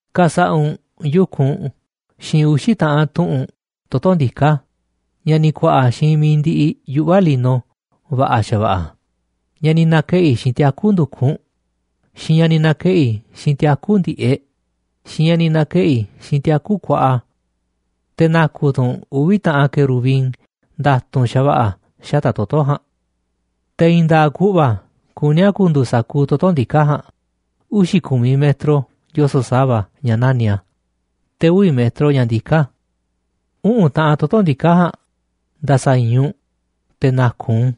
’Ka̱sa̱ꞌa̱ u̱nꞌ yu̱kunꞌ xiinꞌ uxi̱ taꞌan tuꞌu̱nꞌ toto̱ ndiká ña̱ ni̱ ku̱a̱ꞌa̱ xiinꞌ mi̱iꞌ ndiꞌiꞌ yuꞌva̱ lino va̱ꞌa̱ xa̱va̱ꞌa̱, ña̱ ni̱ na̱keꞌi̱ xiinꞌ tiaku̱ ndu̱kunꞌ, xiinꞌ ña̱ ni̱ na̱keꞌi̱ xiinꞌ tiaku̱ ndi̱ꞌeꞌ, xiinꞌ ña̱ ni̱ na̱keꞌi̱ xiinꞌ tiaku̱ kuaꞌa. Te̱ na̱ku̱ tu̱ u̱nꞌ uvi̱ taꞌan querubin nda̱tu̱nꞌ xa̱va̱ꞌa̱ xata̱ꞌ toto̱ ja̱a̱nꞌ. Te̱ i̱i̱n nda̱a̱ꞌ ku̱ꞌva̱ kuní a̱ ku̱ndu̱u̱ sa̱kuuꞌ toto̱ ndiká ja̱a̱nꞌ, uxi̱ ku̱miꞌ metro yoso̱ꞌ sa̱va̱ ña̱ nani̱ꞌ a̱, te̱ uvi̱ metro ña̱ ndiká a̱. Uꞌu̱n taꞌan toto̱ ndiká ja̱a̱nꞌ nda̱sa̱i̱i̱n u̱nꞌ te̱ na̱ku̱ u̱nꞌ u̱n,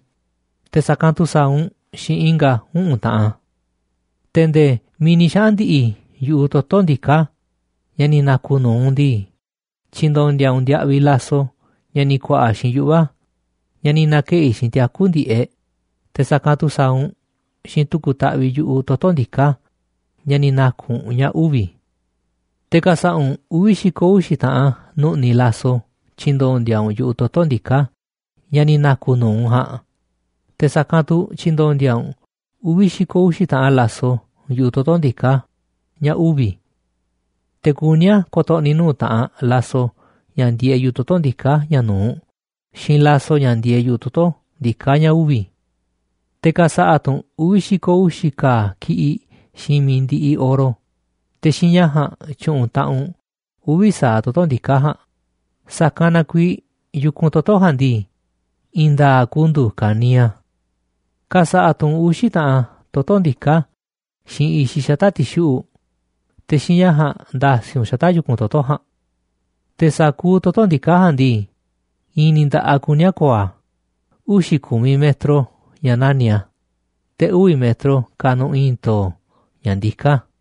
te̱ sa̱kanꞌ tu̱ sa̱a̱ u̱nꞌ xiinꞌ i̱nga̱ uꞌu̱n taꞌan a̱. Te̱ nde̱e̱ miiꞌ ni̱ xaꞌa̱n ndi̱ꞌi̱ yu̱ꞌuꞌ toto̱ ndiká ña̱ ni̱ na̱ku̱ nu̱uꞌ u̱nꞌ ndii, tyi̱ndo̱ndi̱a̱ u̱nꞌ ndiaꞌviꞌ laso ña̱ ni̱ ku̱a̱ꞌa̱ xiinꞌ yuꞌva̱ ña̱ ni̱ na̱keꞌi̱ xiinꞌ tiaku̱ ndi̱ꞌeꞌ, te̱ sa̱kanꞌ tu̱ sa̱a̱ u̱nꞌ xiinꞌ tu̱ku̱ taꞌviꞌ yu̱ꞌuꞌ toto̱ ndiká ña̱ ni̱ na̱ku̱ u̱nꞌ ña̱ uvi̱. Te̱ ka̱sa̱ꞌa̱ u̱nꞌ uvi̱ xi̱ko̱ uxi̱ taꞌan nu̱ꞌni̱ laso tyi̱ndo̱ndi̱a̱ u̱nꞌ yu̱ꞌuꞌ toto̱ ndiká ña̱ ni̱ na̱ku̱ nu̱uꞌ u̱nꞌ ja̱a̱nꞌ, te̱ sa̱kanꞌ tu̱ tyi̱ndo̱ndi̱a̱ u̱nꞌ uvi̱ xi̱ko̱ uxi̱ taꞌan laso yu̱ꞌuꞌ toto̱ ndiká, ña̱ uvi̱, te̱ kuní a̱ ko̱to̱ꞌni̱ nuu̱ꞌ taꞌanꞌ laso ña̱ ndieeꞌ yu̱ꞌuꞌ toto̱ ndiká ña̱ nu̱uꞌ xiinꞌ laso ña̱ ndieeꞌ yu̱ꞌuꞌ toto̱ ndiká ña̱ uvi̱. Te̱ ka̱sa̱ꞌa̱ tu̱ u̱nꞌ uvi̱ xi̱ko̱ uxi̱ ka̱a̱ ki̱ꞌiꞌ xiinꞌ mi̱iꞌ ndiꞌiꞌ oro, te̱ xiinꞌ ña̱ ja̱a̱nꞌ tyu̱ꞌu̱n taꞌanꞌ u̱nꞌ uvi̱ sa̱aꞌ toto̱ ndiká ja̱a̱nꞌ, sa̱kanꞌ na kuiiꞌ yu̱kunꞌ toto̱ ja̱a̱nꞌ ndii, i̱i̱n nda̱a̱ꞌ ku̱ndu̱u̱ ka̱niiꞌ a̱. ’Ka̱sa̱ꞌa̱ tu̱ u̱nꞌ uxi̱ i̱i̱n taꞌan toto̱ ndiká xiinꞌ i̱xiꞌ xata̱ꞌ ti̱xuꞌu̱ꞌ, te̱ xiinꞌ ña̱ ja̱a̱nꞌ nda̱si̱ u̱nꞌ xata̱ꞌ yu̱kun toto̱ jaanꞌ. Te̱ sa̱kuuꞌ toto̱ ndiká ja̱a̱nꞌ ndii, i̱i̱n ni̱ nda̱ꞌaꞌ kuní a̱ ko̱o̱ a̱, uxi̱ ku̱miꞌ metro ña̱ nani̱ꞌ a̱, te̱ uvi̱ metro kanuꞌ i̱i̱n to̱o̱ ña̱ ndiká a̱.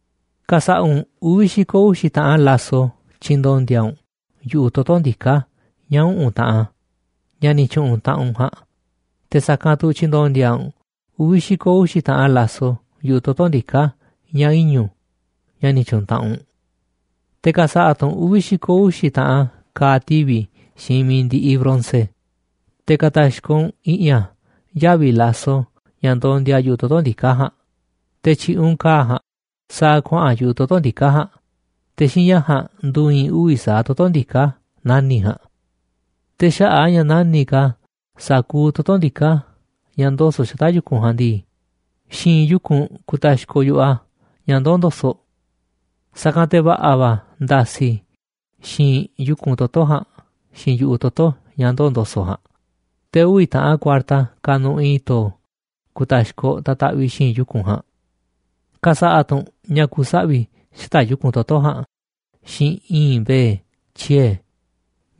Ka̱sa̱ꞌa̱ u̱nꞌ uvi̱ xi̱ko̱ uxi̱ taꞌan laso tyi̱ndo̱ndi̱a̱ u̱nꞌ yu̱ꞌuꞌ toto̱ ndiká ña̱ uꞌu̱n taꞌan ña̱ ni̱ tyu̱ꞌu̱n taꞌanꞌ u̱nꞌ ja̱a̱nꞌ, te̱ sa̱kanꞌ tu̱ tyi̱ndo̱ndi̱a̱ u̱nꞌ uvi̱ xi̱ko̱ uxi̱ taꞌan laso yu̱ꞌuꞌ toto̱ ndiká ña̱ iñu̱, ña̱ ni̱ tyu̱ꞌu̱n taꞌanꞌ u̱nꞌ. Te̱ ka̱sa̱ꞌa̱ tu̱ u̱nꞌ uvi̱ xi̱ko̱ uxi̱ taꞌan ka̱a̱ tivi̱ xiinꞌ mi̱iꞌ ndiꞌiꞌ bronce, te̱ ka̱ta̱xkoꞌ u̱nꞌ i̱ꞌi̱n a̱ yavi̱ laso ña̱ ndondia yu̱ꞌuꞌ toto̱ ndiká ja̱a̱nꞌ, te̱ tyi̱ꞌi̱ u̱nꞌ ka̱a̱ ja̱a̱nꞌ sa̱a̱ kuaꞌa̱n yu̱ꞌuꞌ toto̱ ndiká ja̱a̱nꞌ, te̱ xiinꞌ ña̱ ja̱a̱nꞌ ndu̱i̱i̱n uvi̱ sa̱aꞌ toto̱ ndiká nani̱ꞌ ja̱a̱nꞌ. Te̱ xaꞌa̱ꞌ a̱ ña̱ nani̱ꞌ ka̱ sa̱kuuꞌ toto̱ ndiká ña̱ ndoso̱ꞌ xata̱ꞌ yu̱kunꞌ ja̱a̱nꞌ ndii, xi̱i̱nꞌ yu̱kunꞌ ku̱ta̱xkoꞌ yu̱ꞌuꞌ a̱ ña̱ ndoo̱ ndo̱so̱ꞌ. Sa̱kanꞌ te̱ va̱ꞌa̱ va̱ nda̱si̱ xi̱i̱nꞌ yu̱kunꞌ toto̱ ja̱a̱nꞌ xiinꞌ yu̱ꞌuꞌ toto̱ ña̱ ndoo̱ ndo̱so̱ꞌ ja̱a̱nꞌ, te̱ uvi̱ taꞌan kuarta kanuꞌ i̱i̱n to̱o̱ ku̱ta̱xkoꞌ ta̱taꞌviꞌ xi̱i̱nꞌ yu̱kunꞌ ja̱a̱nꞌ. Ka̱sa̱ꞌa̱ tu̱ u̱nꞌ ña̱ ku̱saꞌvi̱ xata̱ꞌ yu̱kunꞌ toto̱ ja̱a̱nꞌ xiinꞌ i̱i̱nꞌ mbe̱e̱ tyiee̱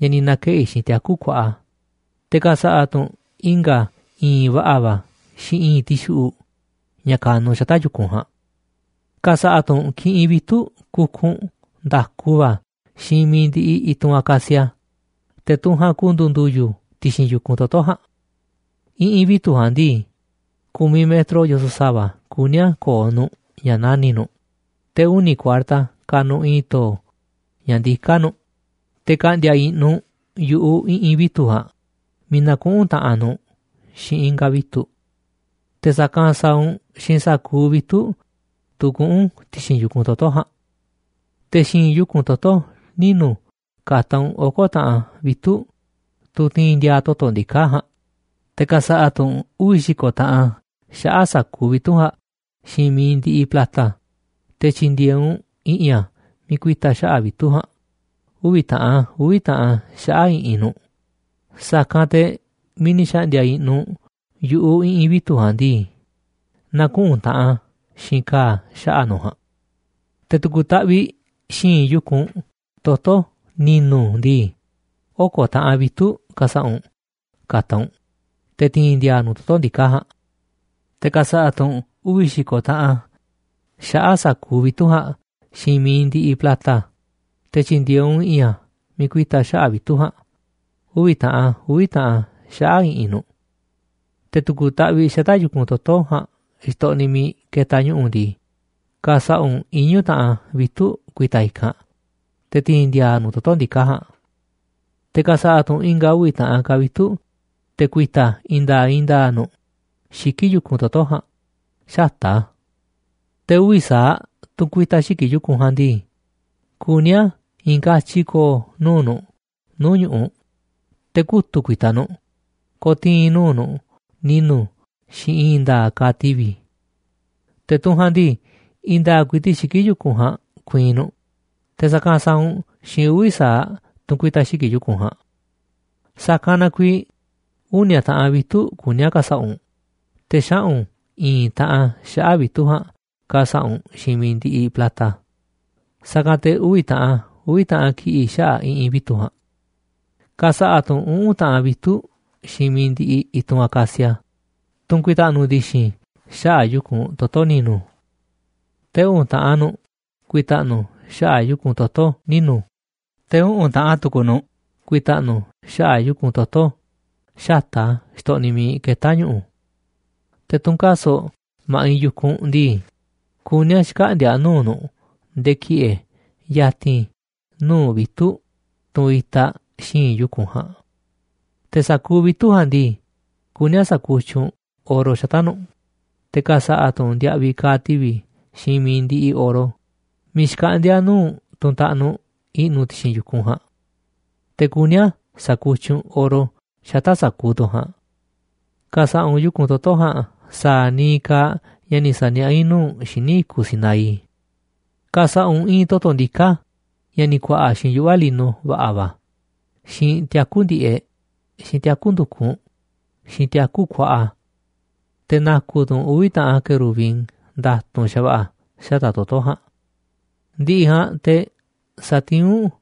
ña̱ ni̱ na̱keꞌi̱ xiinꞌ tiaku kuaꞌa, te̱ ka̱sa̱ꞌa̱ tu̱ u̱nꞌ i̱nga̱ i̱i̱nꞌ va̱ꞌa̱ va̱ xiinꞌ i̱i̱nꞌ tixuꞌuꞌ ña̱ ka̱nuꞌ xata̱ꞌ yu̱kunꞌ ja̱a̱nꞌ. ’Ka̱sa̱ꞌa̱ tu̱ u̱nꞌ kiꞌinꞌ vitu̱ꞌ kukunꞌ nda̱ku va̱ xiinꞌ mi̱iꞌ ndiꞌiꞌ i̱tunꞌ acacia, te̱ tunꞌ ja̱a̱nꞌ ku̱ndu̱u̱ ndu̱yu̱ ti̱xi̱n yu̱kunꞌ toto̱ ja̱a̱nꞌ. I̱ꞌi̱n vitu̱ꞌ ja̱a̱nꞌ ndii, ku̱miꞌ metro yoso̱ꞌ sa̱va̱ kuní a̱ ko̱o̱ nu̱ꞌ ña̱ nani̱ꞌ nu̱ꞌ, te̱ uni̱ kuarta kanuꞌ i̱i̱n to̱o̱ ña̱ ndiká nu̱ꞌ, te̱ ka̱ꞌndi̱a̱ i̱ꞌnu̱ u̱nꞌ yu̱ꞌuꞌ i̱ꞌi̱n vitu̱ꞌ ja̱a̱nꞌ miiꞌ na̱kuꞌu̱n taꞌanꞌ nu̱ꞌ xiinꞌ i̱nga̱ vitu̱ꞌ. Te̱ sa̱kanꞌ sa̱a̱ u̱nꞌ xiinꞌ sa̱kuuꞌ vitu̱ꞌ, tunꞌ kuꞌu̱n ti̱xi̱n yu̱kunꞌ toto̱ ja̱a̱nꞌ. Te̱ xi̱i̱nꞌ yu̱kunꞌ toto̱ ninu̱ ka̱ta̱ u̱nꞌ oko̱ taꞌan vitu̱ꞌ, tunꞌ ti̱i̱n ndi̱a̱a̱ toto̱ ndiká ja̱a̱nꞌ, te̱ ka̱sa̱ꞌa̱ tu̱ u̱nꞌ uvi̱ xi̱ko̱ taꞌan xaꞌa̱ꞌ sa̱kuuꞌ vitu̱ꞌ ja̱a̱nꞌ xiinꞌ mi̱iꞌ ndiꞌiꞌ plata, te̱ tyi̱ndi̱e̱e̱ u̱nꞌ i̱ꞌi̱n a̱ miiꞌ ku̱i̱ta̱ xaꞌa̱ꞌ vitu̱ꞌ ja̱a̱nꞌ, uvi̱ taꞌan a̱ uvi̱ taꞌan a̱ xaꞌa̱ꞌ i̱ꞌi̱n nu̱ꞌ, sa̱kanꞌ te̱ miiꞌ ni̱ xa̱ꞌndi̱a̱ i̱ꞌnu̱ u̱nꞌ yu̱ꞌuꞌ i̱ꞌi̱n vitu̱ꞌ ja̱a̱nꞌ ndii, na̱kuꞌu̱n taꞌanꞌ a̱ xiinꞌ ka̱a̱ xaꞌa̱ꞌ nu̱ꞌ ja̱a̱nꞌ. ’Te̱ tu̱ku̱ taꞌviꞌ xi̱i̱nꞌ yu̱kunꞌ toto̱ ni̱nu̱ ndii, oko̱ taꞌan vitu̱ꞌ ka̱sa̱ꞌa̱ u̱nꞌ ka̱ta̱ u̱nꞌ te̱ ti̱i̱n ndi̱a̱a̱ nu̱ꞌ toto̱ ndiká ja̱a̱nꞌ. Te̱ ka̱sa̱ꞌa̱ tu̱ u̱nꞌ uvi̱ xi̱ko̱ taꞌan a̱ xaꞌa̱ꞌ sa̱kuuꞌ vitu̱ꞌ ja̱a̱nꞌ xiinꞌ mi̱iꞌ ndiꞌiꞌ plata, te̱ tyi̱ndi̱e̱e̱ u̱nꞌ i̱ꞌi̱n a̱ miiꞌ ku̱i̱ta̱ xaꞌa̱ꞌ vitu̱ꞌ ja̱a̱nꞌ uvi̱ taꞌan a̱ uvi̱ taꞌan a̱ xaꞌa̱ꞌ i̱ꞌi̱n nu̱ꞌ. Te̱ tu̱ku̱ taꞌviꞌ xata̱ꞌ yu̱kunꞌ toto̱ ja̱a̱nꞌ xtoꞌniꞌ miiꞌ ketaꞌ ñu̱ꞌu̱ ndii, ka̱sa̱ꞌa̱ u̱nꞌ iñu̱ taꞌan vitu̱ꞌ ku̱i̱ta̱ i̱kanꞌ te̱ ti̱i̱n ndi̱a̱a̱ nu̱ꞌ toto̱ ndiká ja̱a̱nꞌ. Te̱ ka̱sa̱ꞌa̱ tu̱ u̱nꞌ i̱nga̱ uvi̱ taꞌan ka̱ vitu̱ꞌ te̱ ku̱i̱ta̱ i̱i̱n nda̱a̱ꞌ i̱i̱n nda̱a̱ꞌ nu̱ꞌ xiki̱ꞌ yu̱kunꞌ toto̱ ja̱a̱nꞌ xata̱ꞌ a̱. Te̱ uvi̱ sa̱aꞌ tunꞌ ku̱i̱ta̱ xiki̱ꞌ yu̱kunꞌ ja̱a̱nꞌ ndii, kuní a̱ i̱i̱n katyi ko̱o̱ nuu̱ꞌ nu̱ꞌ nuu̱ꞌ ñu̱ꞌuꞌ, te̱ kutu̱ꞌ ku̱i̱ta̱ nu̱ꞌ ko̱tii̱n nuu̱ꞌ nu̱ꞌ ni̱nu̱ xiinꞌ i̱i̱n nda̱a̱ꞌ ka̱a̱ tivi̱. Te̱ tunꞌ ja̱a̱nꞌ ndii, i̱i̱n nda̱a̱ꞌ ku̱i̱ti̱ꞌ xiki̱ꞌ yu̱kunꞌ ja̱a̱nꞌ ku̱i̱i̱n nu̱ꞌ, te̱ sa̱kanꞌ sa̱a̱ u̱nꞌ xiinꞌ uvi̱ sa̱aꞌ tunꞌ ku̱i̱ta̱ xiki̱ꞌ yu̱kunꞌ ja̱a̱nꞌ. Sa̱kanꞌ na kuiiꞌ uni̱a̱ taꞌan vitu̱ꞌ kuní a̱ ka̱sa̱ꞌa̱ u̱nꞌ, te̱ xaꞌu̱n i̱i̱n taꞌan xaꞌa̱ꞌ vitu̱ꞌ ja̱a̱nꞌ ka̱sa̱ꞌa̱ u̱nꞌ xiinꞌ mi̱iꞌ ndiꞌiꞌ plata, sa̱kanꞌ te̱ uvi̱ taꞌan a̱ uvi̱ taꞌan ki̱ꞌi̱ xaꞌa̱ꞌ i̱ꞌi̱n vitu̱ꞌ ja̱a̱nꞌ. ’Ka̱sa̱ꞌa̱ tu̱ u̱nꞌ uꞌu̱n taꞌan vitu̱ꞌ xiinꞌ miiꞌ ndiꞌiꞌ i̱tunꞌ acacia, tunꞌ ku̱i̱ta̱ꞌnu̱ ndi̱xi̱n xaꞌa̱ꞌ yu̱kunꞌ toto̱ ni̱nu̱, te̱ uꞌu̱n taꞌan nu̱ꞌ ku̱i̱ta̱ꞌnu̱ xaꞌa̱ꞌ yu̱kunꞌ toto̱ ninu̱, te̱ uꞌu̱n taꞌan tu̱ku̱ nu̱ꞌ ku̱i̱ta̱ꞌnu̱ xaꞌa̱ꞌ yu̱kunꞌ toto̱ xata̱ꞌ a̱ xtoꞌniꞌ miiꞌ ketá ñu̱ꞌu̱. Te̱ tunꞌ kaso̱ꞌ ma̱ꞌiꞌ yu̱kunꞌ ndii, kuní a̱ xkaꞌndi̱a̱ nuu̱ꞌ nu̱ꞌ nde̱e̱ ki̱ꞌe̱ ya̱ti̱n nuu̱ꞌ vitu̱ꞌ, tunꞌ itaꞌ xi̱i̱nꞌ yu̱kunꞌ ja̱a̱nꞌ. Te̱ sa̱kuuꞌ vitu̱ꞌ ja̱a̱nꞌ ndii, kuní a̱ sa̱kutyiꞌ u̱nꞌ oro xata̱ꞌ nu̱ꞌ, te̱ ka̱sa̱ꞌa̱ tu̱ u̱nꞌ ndiaꞌviꞌ ka̱a̱ tivi̱ xiinꞌ mi̱iꞌ ndiꞌiꞌ oro miiꞌ xkaꞌndi̱a̱ nuu̱ꞌ tunꞌ taꞌnuꞌ i̱ꞌnu̱ ti̱xi̱n yu̱kunꞌ ja̱a̱nꞌ. Te̱ kuní a̱ sa̱kutyiꞌ u̱nꞌ oro xata̱ꞌ sa̱kuuꞌ tunꞌ ja̱a̱nꞌ. Ka̱sa̱ꞌa̱ u̱nꞌ yu̱kunꞌ toto̱ ja̱a̱nꞌ sa̱a̱ niiꞌ kaaꞌ ña̱ ni̱ sa̱niaꞌá i̱ nuu̱ꞌ u̱nꞌ xíniꞌ i̱kuꞌ Sinaí. ’Ka̱sa̱ꞌa̱ u̱nꞌ i̱i̱n toto̱ ndiká ña̱ ni̱ ku̱a̱ꞌa̱ xiinꞌ yuꞌva lino va̱ꞌa̱ va̱, xiinꞌ tiaku̱ ndi̱ꞌeꞌ, xiinꞌ tiaku̱ ndu̱kunꞌ, xiinꞌ tiaku̱ kuaꞌa. Te̱ na̱ku̱ tu̱ u̱nꞌ uvi̱ taꞌan querubin nda̱tu̱nꞌ xa̱va̱ꞌa̱ xata̱ꞌ toto̱ ja̱a̱nꞌ. Ndiꞌiꞌ ja̱a̱nꞌ te̱ sa̱tiín u̱nꞌ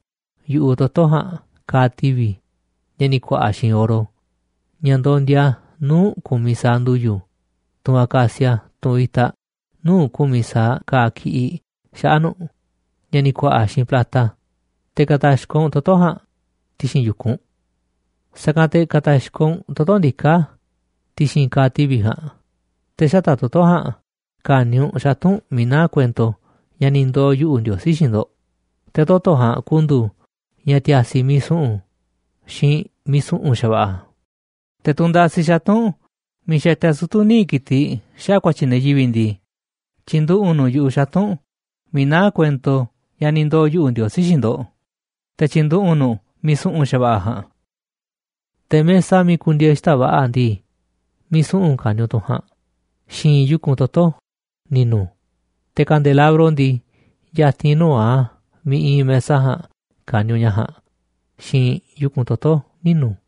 yu̱ꞌuꞌ toto̱ ja̱a̱nꞌ ka̱a̱ tivi̱ ña̱ ni̱ ku̱a̱ꞌa̱ xiinꞌ oro, ña̱ ndondia nuu̱ꞌ ku̱miꞌ sa̱aꞌ ndu̱yu̱, tunꞌ acacia tunꞌ itaꞌ nuu̱ꞌ ku̱miꞌ sa̱aꞌ ka̱a̱ kiꞌiꞌ xaꞌa̱ꞌ nu̱ꞌ ña̱ ni̱ ku̱a̱ꞌa̱ xiinꞌ plata, te̱ ka̱ta̱xkoꞌ u̱nꞌ toto̱ ja̱a̱nꞌ ti̱xi̱n yu̱kunꞌ. Sa̱kanꞌ te̱ ka̱ta̱xkoꞌ u̱nꞌ toto̱ ndiká ti̱xi̱n ka̱a̱ tivi̱ ja̱a̱nꞌ, te̱ xata̱ꞌ toto̱ ja̱a̱nꞌ ka̱ni̱ u̱nꞌ xatu̱nꞌ miiꞌ naá kuento ña̱ ni̱ ndoo̱ yuꞌu̱, Ndiosí, xiinꞌ ndo̱ꞌ, te̱ toto̱ ja̱a̱nꞌ ku̱ndu̱u̱ ña̱ ti̱a̱si̱ miiꞌ su̱ꞌu̱n, xiinꞌ miiꞌ su̱ꞌu̱n xa̱va̱ꞌa̱. Te̱ tunꞌ ndasi xatu̱nꞌ miiꞌ xatia sutu̱ níiꞌ ki̱tiꞌ xaꞌa̱ꞌ ku̱a̱tyi̱ ne̱ yivi̱ꞌ ndii, tyi̱nduꞌu̱ꞌ u̱nꞌ nu̱ꞌ yu̱ꞌuꞌ xatu̱nꞌ miiꞌ naá kuento ña̱ ni̱ ndoo̱ yuꞌu̱, Ndiosí, xiinꞌ ndo̱ꞌ, te̱ tyi̱nduꞌu̱ꞌ u̱nꞌ nu̱ꞌ miiꞌ su̱ꞌu̱n va̱ ja̱a̱nꞌ. Te̱ mesa miiꞌ ku̱ndi̱e̱e̱ xita̱ꞌ va̱ꞌa̱ ndii, miiꞌ su̱ꞌu̱n ka̱ni̱ u̱nꞌ tunꞌ ja̱a̱nꞌ xi̱i̱nꞌ yu̱kunꞌ toto̱ ni̱nu̱, te̱ kandelabro ndii, ya̱ti̱n nuu̱ꞌ a̱ miiꞌ iinꞌ mesa ja̱a̱nꞌ ka̱ni̱ ña̱ ja̱a̱nꞌ xi̱i̱nꞌ yu̱kunꞌ toto̱ ninu̱.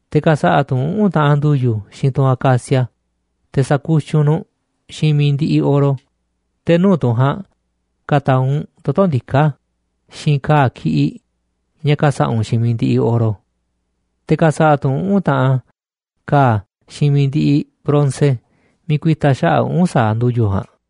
Te̱ ka̱sa̱ꞌa̱ tu̱ u̱nꞌ uꞌu̱n taꞌan ndu̱yu̱ xiinꞌ tunꞌ acacia, te̱ sa̱kutyiꞌ u̱nꞌ nu̱ꞌ xiinꞌ mi̱iꞌ ndiꞌiꞌ oro, te̱ nuu̱ꞌ tunꞌ ja̱a̱nꞌ ka̱ta̱a̱ u̱nꞌ toto̱ ndiká, xiinꞌ ka̱a̱ ki̱ꞌiꞌ ña̱ ka̱sa̱ꞌa̱ u̱nꞌ xiinꞌ mi̱iꞌ ndiꞌiꞌ oro. Te̱ ka̱sa̱ꞌa̱ tu̱ u̱nꞌ uꞌu̱n taꞌan ka̱a̱ xiinꞌ mi̱iꞌ ndiꞌiꞌ bronce miiꞌ ku̱i̱ta̱ xaꞌa̱ꞌ uꞌu̱n sa̱aꞌ ndu̱yu̱ ja̱a̱nꞌ.